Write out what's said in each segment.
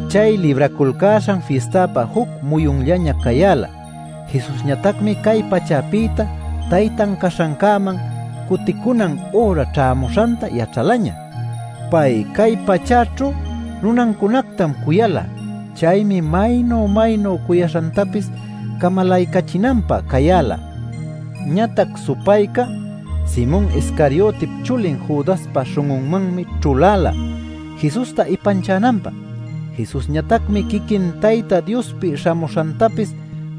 Chay Libraculcäśhan Fistapä juc muyunllañam cayäla. Jesusñatacmi cay pachäpïta Taytan caśhancäman cuticunan üra ćhämuśhanta yaćhalaña. Pay cay pachäćhu nunancunactam cuyala. Chaymi maynu-maynu cuyaśhantapis camalaycachinanpä cayäla. Ñatac supayca Simon Iscariotip chulin Judaspa śhun'unmanmi ćhuläla Jesusta ipanchananpä. Jesusñatacmi quiquin Tayta Diospi śhamuśhantapis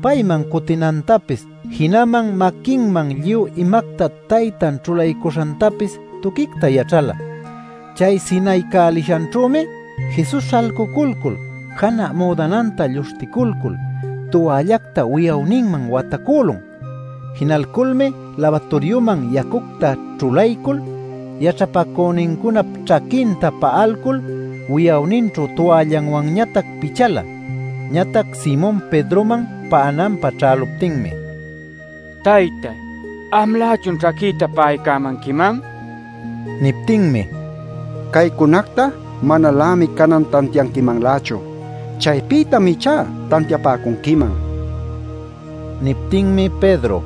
payman cutinantapis, jinaman maquinman lluy imacta Taytan ćhulaycuśhantapis tuquicta yaćhala. Chay sinayalcäśhanćhümi Jesus śhalcuculcul janä müdananta lluśhticulcul tuallacta wi'awninman watacülun. Jinalculmi labaturiuman yacucta ćhulaycul yaćhapacünincunap ćhaquinta pa'alcul wi'awninćhu tualläwanñatac pichala. Ñatac Simon Pedroman pa'ananpä ćhäluptinmi: “Taytay ¿amlächun ćhaquïta pa'ayämanquiman?” nin. Niptinmi: “Caycunacta manalämi canan tantianquimanlächu. Chaypïtam ichá tantiapäcunquiman” nin. Niptinmi Pedro: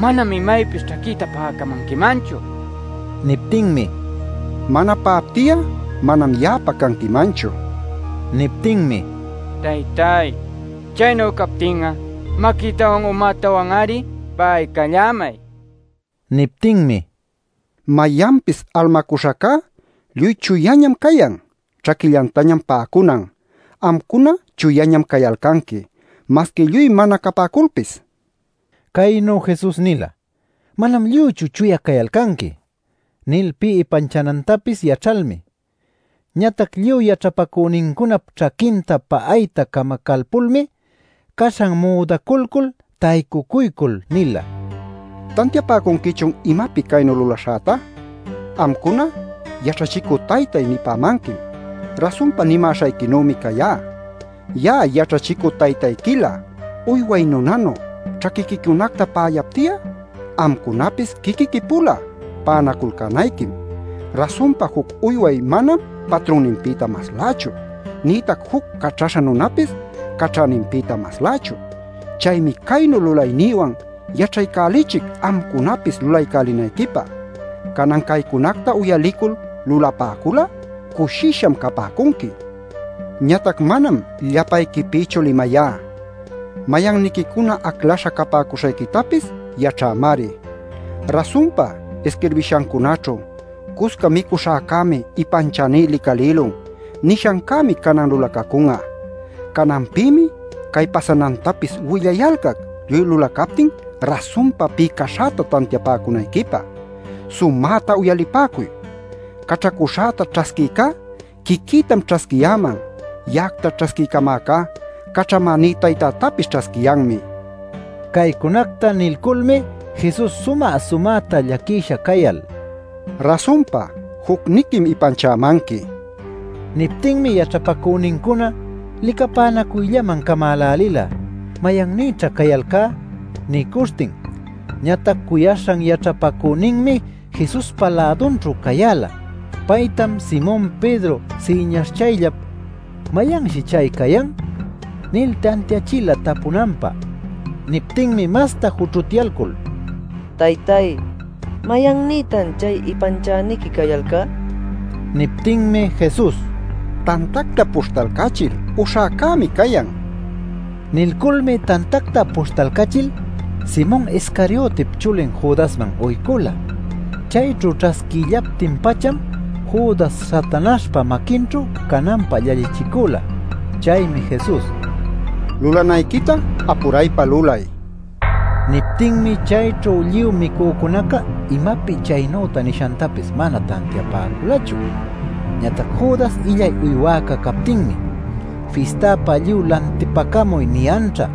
“Manam imaypis ćhaquïtá pa'acamanquimanchu” nil mićhacula. Niptinmi: “Mana pa'apti'a, manam ya'apä canquimanchu” nin. Niptinmi: “Taytay, chaynu captin'a, maquïtawan umätawan-ari pa'aycallämay” nin. Niptinmi: “Mayanpis almacuśhacá lluy chuyañam cayan; ćhaquillantañam pa'acunan. Amcuna chuyañam cayalcanqui, masqui lluy mana capäculpis” nin. Caynu Jesus nila “Manam lluychu chuya cayalcanqui” nil pï ipanchanantapis yaćhalmi. Ñatac lluy yaćhapacünincunap ćhaquinta pa'ayta camacalpulmi, caśhan müdaculcul taycucuycul nila: “¿Tantiapäcunquichun imapi caynu lulaśhäta? Amcuna ‘Yaćhachicü taytay’ nipämanquim. Rasunpa nimäśhayquinümi cayá. Ya'a yaćhachicü taytayquilä uyway nunanu ćhaquiquicunacta pa'ayapti'a, amcunapis quiquiqui-pula pa'anaculcänayquim. Rasunpa juc uyway manam patrunninpïta maslächu, nïtac juc caćhaśha nunapis caćhäninpïta maslächu. Chaymi caynu lulaynïwan yaćhaycälichic amcunapis lulaycälinayquipä. Canan caycunacta uyalicul lulapäcul'a cushisham capäcunqui. “Ñatac manam llapayquipïchu limayá. Mayanniquicuna aclaśha capäcuśhayquitapis yaćhämari. Rasunpa isquirbishancunaćhu ‘Cusca micuśhäcämi ipanchäní licalïlun’ nishancämi canan lulacacun'a. Cananpïmi cay pasanantapis willayalcac lluy lulacaptin rasunpa pï caśhäta tantiapäcunayquipä. Sumäta uyalipäcuy: caćhacuśhäta ćhasquïcá quiquïtam ćhasquiyäman; ya'acta ćhasquiycamäcá caćhamäní Taytätapis ćhasquiyanmi” nin. Caycunacta nilculmi Jesus sumä-sumäta llaquisha cayal: “Rasunpa jucniquim ipanchapämanqui” nin. Niptinmi yaćhapacünincuna licapänacuyllaman camälälila, “¿Mayannïćha cayalcá?” nicuśhtin. Ñatac cuyaśhan yaćhapacüninmi Jesuspa lädunćhu cayäla. Paytam Simon Pedro siñaśhchayllap “¿Mayanshi chay cayan?” nil tantiachila tapunanpä. Niptinmi masta jućhutyalcul: “Taytay, ¿mayannïtan chay ipanchäniqui cayalcá?” nin. Niptinmi Jesus: “Tantacta puśhtalcachil uśhäcämi cayan” nin. Nilculmi tantacta puśhtalcachil Simon Iscariotip chulin Judasman uycula. Chayćhu ćhasquïllaptin-pacham Judas Satanaśhpa maquinćhu cananpä llallichicüla. Chaymi Jesus: “Lulanayquita apuraypa lulay” nin. Niptinmi chayćhu lluy micücunaca imapi chaynüta nishantapis mana tantiapäculachu. Ñatac Judas illay uywäca captinmi “ ‘Fistäpä lluy lantipacamuy’ niyanćha,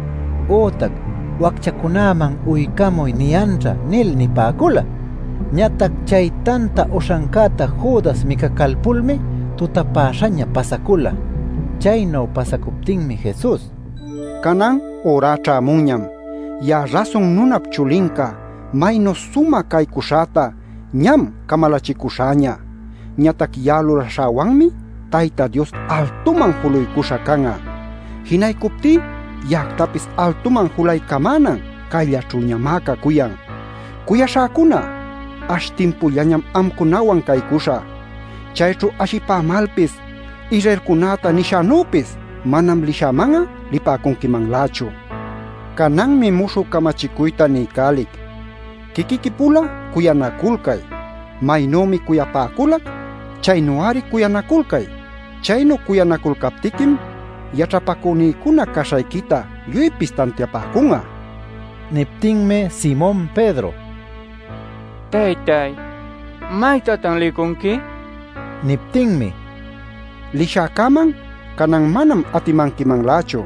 ütac ‘Wacchacunaman uycamuy’ niyanćha” nil nipäcula. Ñatac chay tanta uśhancäta Judas micacalpulmi tutapäśhaña pasacula. Chaynu pasacuptinmi Jesus: “Canan ürá ćhämunñam. Ya'a Rasun Nunap Chulinca maynu sumä caycuśhäta ñam camalachicuśhäña. Ñatac ya'a lulaśhäwanmi Tayta Dios altuman juluycuśha can'a. Jinaycuptí ya'actapis altuman julaycamänan cayllaćhüñamá cacuyan. “Cuyaśhäcuna, ash timpullañam amcunawan caycuśhä. Chayćhu ashipämalpis Israelcunäta nishänüpis manam lishäman'a lipäcunquimanlächu. Cananmi muśhü camachicuyta niycälic: quiquiqui-pula cuyanaculcay. Maynümi cuyapäculac chaynu-ari cuyanaculcay. Chaynu cuyanaculcaptiquim yaćhapacünïcuna caśhayquita lluypis tantiapäcun'a” nin. Niptinmi Simon Pedro: “Taytay, ¿maytatan licunqui?” nin. Niptinmi: “Lishäcäman canan manam atimanquimanlächu.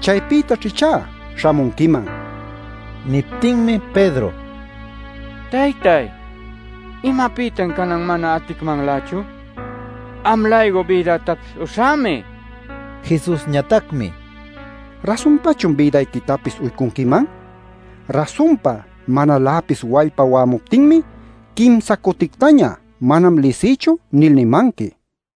Chaypïtaćh ichá śhamunquiman” nin. Niptinmi Pedro: “¿Taytay, imapïtan canan mana aticmanlächu? Am-laycu bïdätapis uśhämi” nicuyan. Jesusñatacmi: “¿Rasunpachun bïdayquitapis uycunquiman? Rasunpa manaläpis wallpa wa'amuptinmi, quimsa cutictaña ‘Manam lisïchu’ nil nimanqui” nin.